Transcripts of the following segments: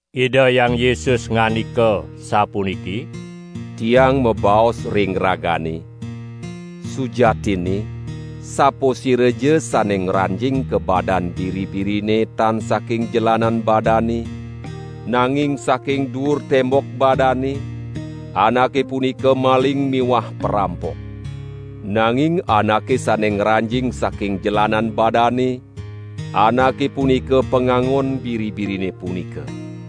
Ida Hyang Yesus ngandika sapuniki: "Tiang mabaos ring ragane: Sujatinne sapasiraja sane ngranjing ka badan biri-birine tan saking jelanan badane, nanging saking duur tembok badane, anake punika maling miwah parampok. Nanging anake sane ngranjing saking jelanan badane, anake punika pangangon biri-birine punika.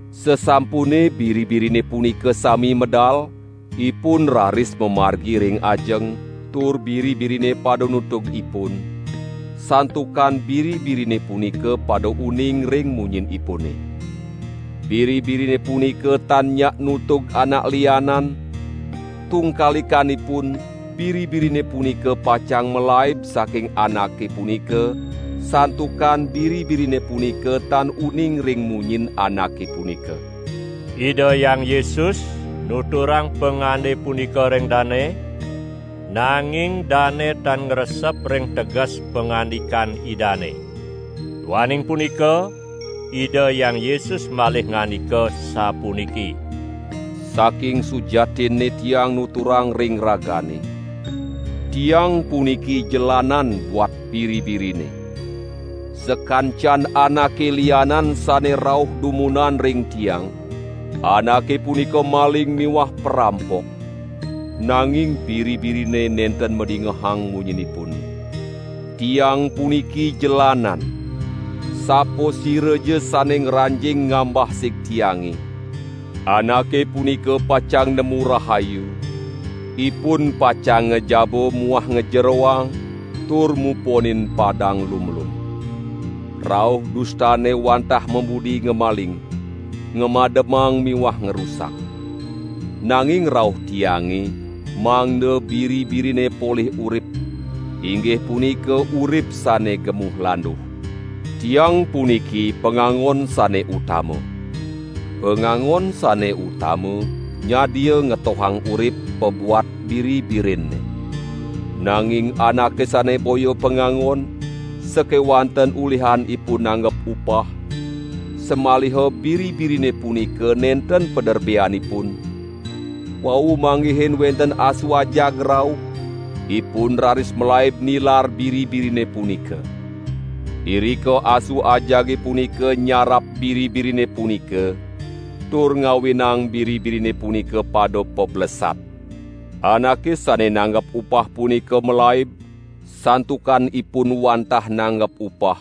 Sasampune biri-birine punika sami medal, ipun raris mamargi ring ajeng tur biri-birine pada nutug ipun, santukan biri-birine punika pada uning ring munyinipune. Biri-birine punika tan nyak nutug anak lianan, tungkalikanipun biri-birine punika pacang malaib saking anake punika, santukan biri-birine punika tan uning ring munyin anake punika." Ida Hyang Yesus nuturang pangande punika ring dane, nanging dane tan ngresep ring teges pangandikan Idane. Duaning punika Ida Hyang Yesus malih ngandika sapuniki: "Saking sujatinne Tiang nuturang ring ragane: Tiang puniki jelanan buat biri-birine. Sakancan anake lianan sane rauh dumunan ring Tiang, anake punika maling miwah parampok; nanging biri-birine nenten madingehang munyinipune. Tiang puniki jelanan. Sapasiraja sane ngranjing ngambah sig Tiange, anake punika pacang nemu rahayu; ipun pacang ngajaba muah ngajeroang tur muponin padang lumlum. Rauh dustane wantah mabudi ngamaling, ngamademang miwah ngrusak. Nanging rauh Tiange, mangda biri-birine polih urip inggih punika urip sane gemuh landuh. Tiang puniki pangangon sane utama. Pangangon sane utama nyadia ngetohang urip pabuat biri-birinne. Nanging anake sane boya pangangon, sakewanten ulihan ipun nanggap upah, samaliha biri-birine punika nenten paderbeanipun, wau manggihin wenten asu ajag rauh, ipun raris malaib nilar biri-birine punika. Irika asu ajage punika nyarap biri-birine punika, tur ngawinang biri-birine punika pada pablesat. Anake sane nanggap upah punika malaib, santukan ipun wantah nanggap upah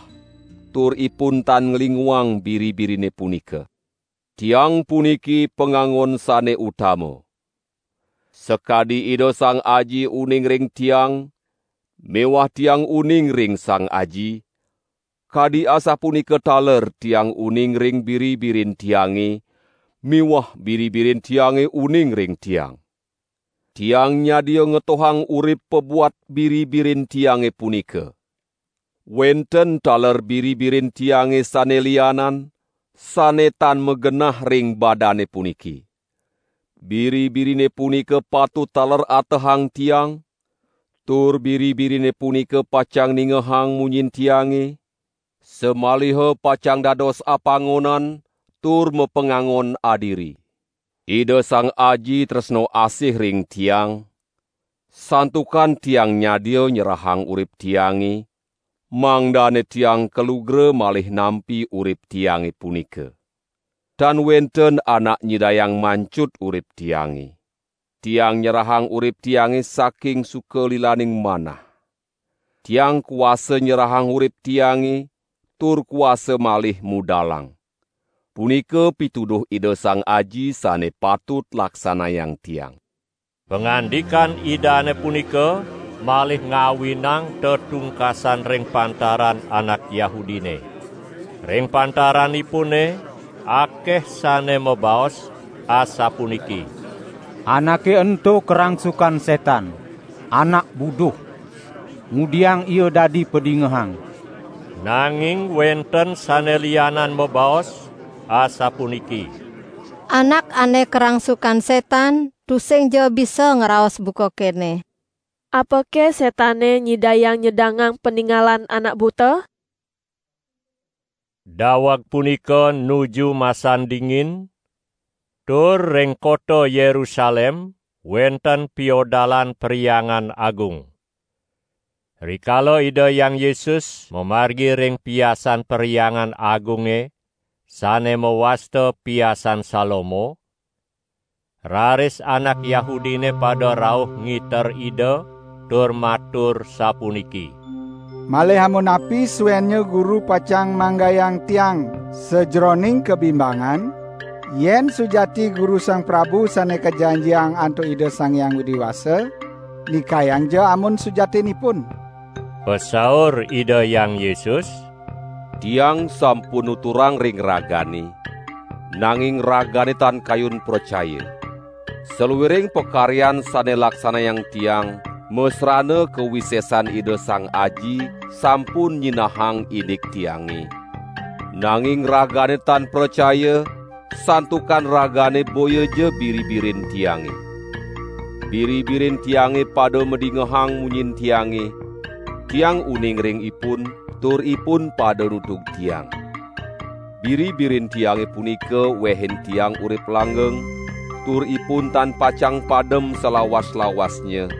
tur ipun tan nglinguang biri-birine punika. Tiang puniki pangangon sane utama. Sakadi Ida Sang Aji uning ring Tiang miwah Tiang uning ring Sang Aji, kadi asapunika taler Tiang uning ring biri-birin Tiange miwah biri-birin Tiange uning ring Tiang. Tiang nyadia ngetohang urip pabuat biri-birin Tiange punika. Wenten taler biri-birin Tiange sane lianan, sane tan magenah ring badane puniki. Biri-birine punika patut taler atehang Tiang, tur biri-birine punika pacang ningehang munyin Tiange, samaliha pacang dados apangonan tur mapangangon adiri. Ida Sang Aji tresna asih ring Tiang, santukan Tiang nyadia nyerahang urip Tiange, mangdane Tiang kalugra malih nampi urip Tiange punika. Tan wenten anak nyidayang mancut urip Tiange. Tiang nyerahang urip Tiange saking suka lilaning manah. Tiang kuasa nyerahang urip Tiange tur kuasa malih mudalang. Punika pituduh Ida Sang Aji sane patut laksanayang Tiang." Pangandikan Idane punika malih ngawinang tetungkasan ring pantaran anak Yahudine. Ring pantaranipune akeh sane mabaos asapuniki: "Anake ento karangsukan setan! Anak buduh! Ngudiang Ia dadi padingehang?" Nanging wenten sane lianan mabaos asapuniki: "Anak ane karangsukan setan tusingja bisa ngraos buka kene! Apake setane nyidayang nyedangang paningalan anak buta?" Daweg punika nuju masan dingin, tur ring kota Yerusalem wenten Piodalan Perhyangan Agung. Rikala Ida Hyang Yesus mamargi ring piasan Perhyangan Agunge sane mawasta Piasan Salomo, raris anak Yahudine pada rauh ngiter Ida tur matur sapuniki: "Malih amunapi suennya Guru pacang manggayang tiang sajeroning kabimbangan? Yen sujati Guru Sang Prabu Sane Kajanjiang antuk Ida Sang Hyang Widi Wasa, nikayangja amun sujatinipun!" Pasaur Ida Hyang Yesus: "Tiang sampun nuturang ring ragane, nanging ragane tan kayun pracaya. Saluiring pakaryan sane laksanayang Tiang, masrana kawisesan Ida Sang Aji, sampun nyinahang indik Tiange; nanging ragane tan pracaya, santukan ragane boyaja biri-birin Tiange. Biri-birin Tiange pada madingehang munyin Tiange; Tiang uning ring ipun, tur ipun pada nutug Tiang. Biri-birin Tiange punika wehin Tiang urip langgeng, tur ipun tan pacang padem salawas-lawasnya;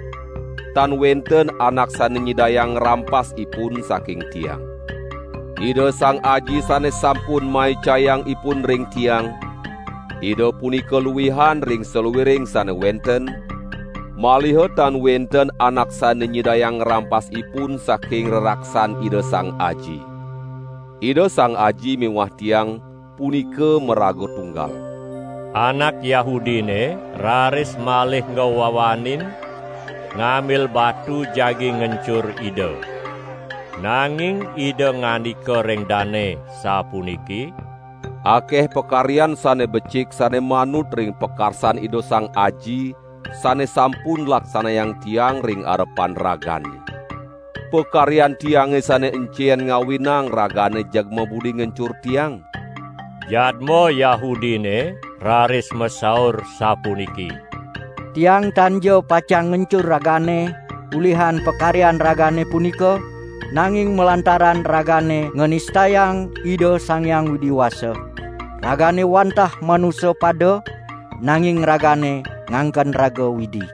tan wenten anak sane nyidayang ngrampas ipun saking Tiang. Ida Sang Aji sane sampun maicayang ipun ring Tiang, Ida punika luihan ring saluiring sane wenten, maliha tan wenten anak sane nyidayang ngrampas ipun saking reraksan Ida Sang Aji. Ida Sang Aji miwah Tiang, punika maraga tunggal." Anak Yahudine raris malih ngwawanin ngambil batu jagi ngencur Ida. Nanging Ida ngandika ring dane sapuniki: "Akeh pakaryan sane becik sane manut ring pakarsan Ida Sang Aji, sane sampun laksanayang Tiang ring arepan ragane; pakaryan Tiange sane encen ngawinang ragane jeg mabudi ngencur Tiang?" Jadma Yahudine raris masaur sapuniki: "Tiang tanja pacang ngencur Ragane ulihan pakaryan Ragane punika, nanging malantaran Ragane nganistayang Ida Sang Hyang Widi Wasa! Ragane wantah manusa pada, nanging ragane nganken raga widi!"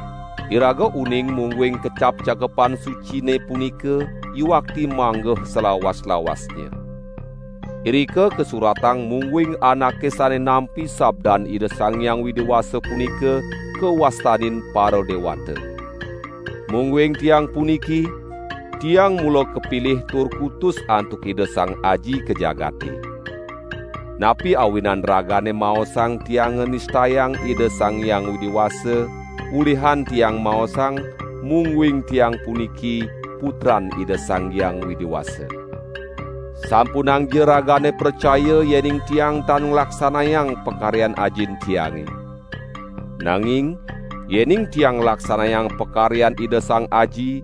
Iraga uning mungguing kecap Cakepan Sucine punika yuakti manggeh salawas-lawasnya. Irika kasuratang mungguing anake sane nampi sabdan Ida Sang Hyang Widi Wasa punika kawastanin paradewata. Mungguing Tiang puniki, Tiang mula kapilih tur kutus antuk Ida Sang Aji ka jagate. Napi awinan ragane maosang Tiang nganistayang Ida Sang Hyang Widi Wasa, ulihan Tiang maosang mungguing Tiang puniki Putran Ida Sang Hyang Widi Wasa. Sampunangja ragane pracaya yening Tiang tan nglaksanayang pakaryan Ajin Tiange. Nanging yening Tiang nglaksanayang pakaryan Ida Sang Aji,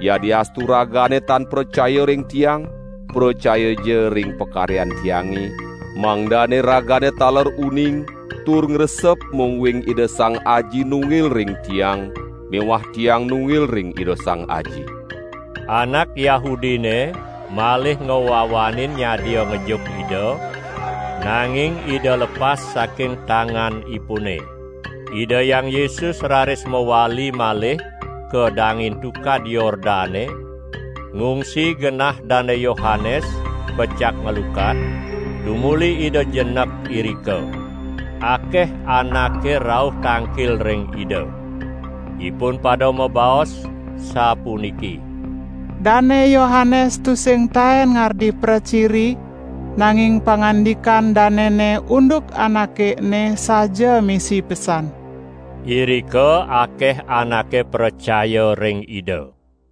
yadiastu ragane tan pracaya ring Tiang, pracayaja ring pakaryan Tiange, mangdane ragane taler uning tur ngresep mungguing Ida Sang Aji nunggil ring Tiang miwah Tiang nunggil ring Ida Sang Aji." Anak Yahudine malih ngwawanin nyadia ngejuk Ida, nanging Ida lepas saking tanganipune. Ida Hyang Yesus raris mawali malih ka dangin Tukad Yordane ngungsi genah Dane Yohanes pecak nglukat, tumuli Ida jenek irika. Akeh anake rauh tangkil ring Ida. Ipun pada mabaos, sapuniki: "Dane Yohanes tusing taen ngardi praciri, nanging pangandikan danene unduk Anake ene saja misi pesan." Irika akeh anake pracaya ring Ida.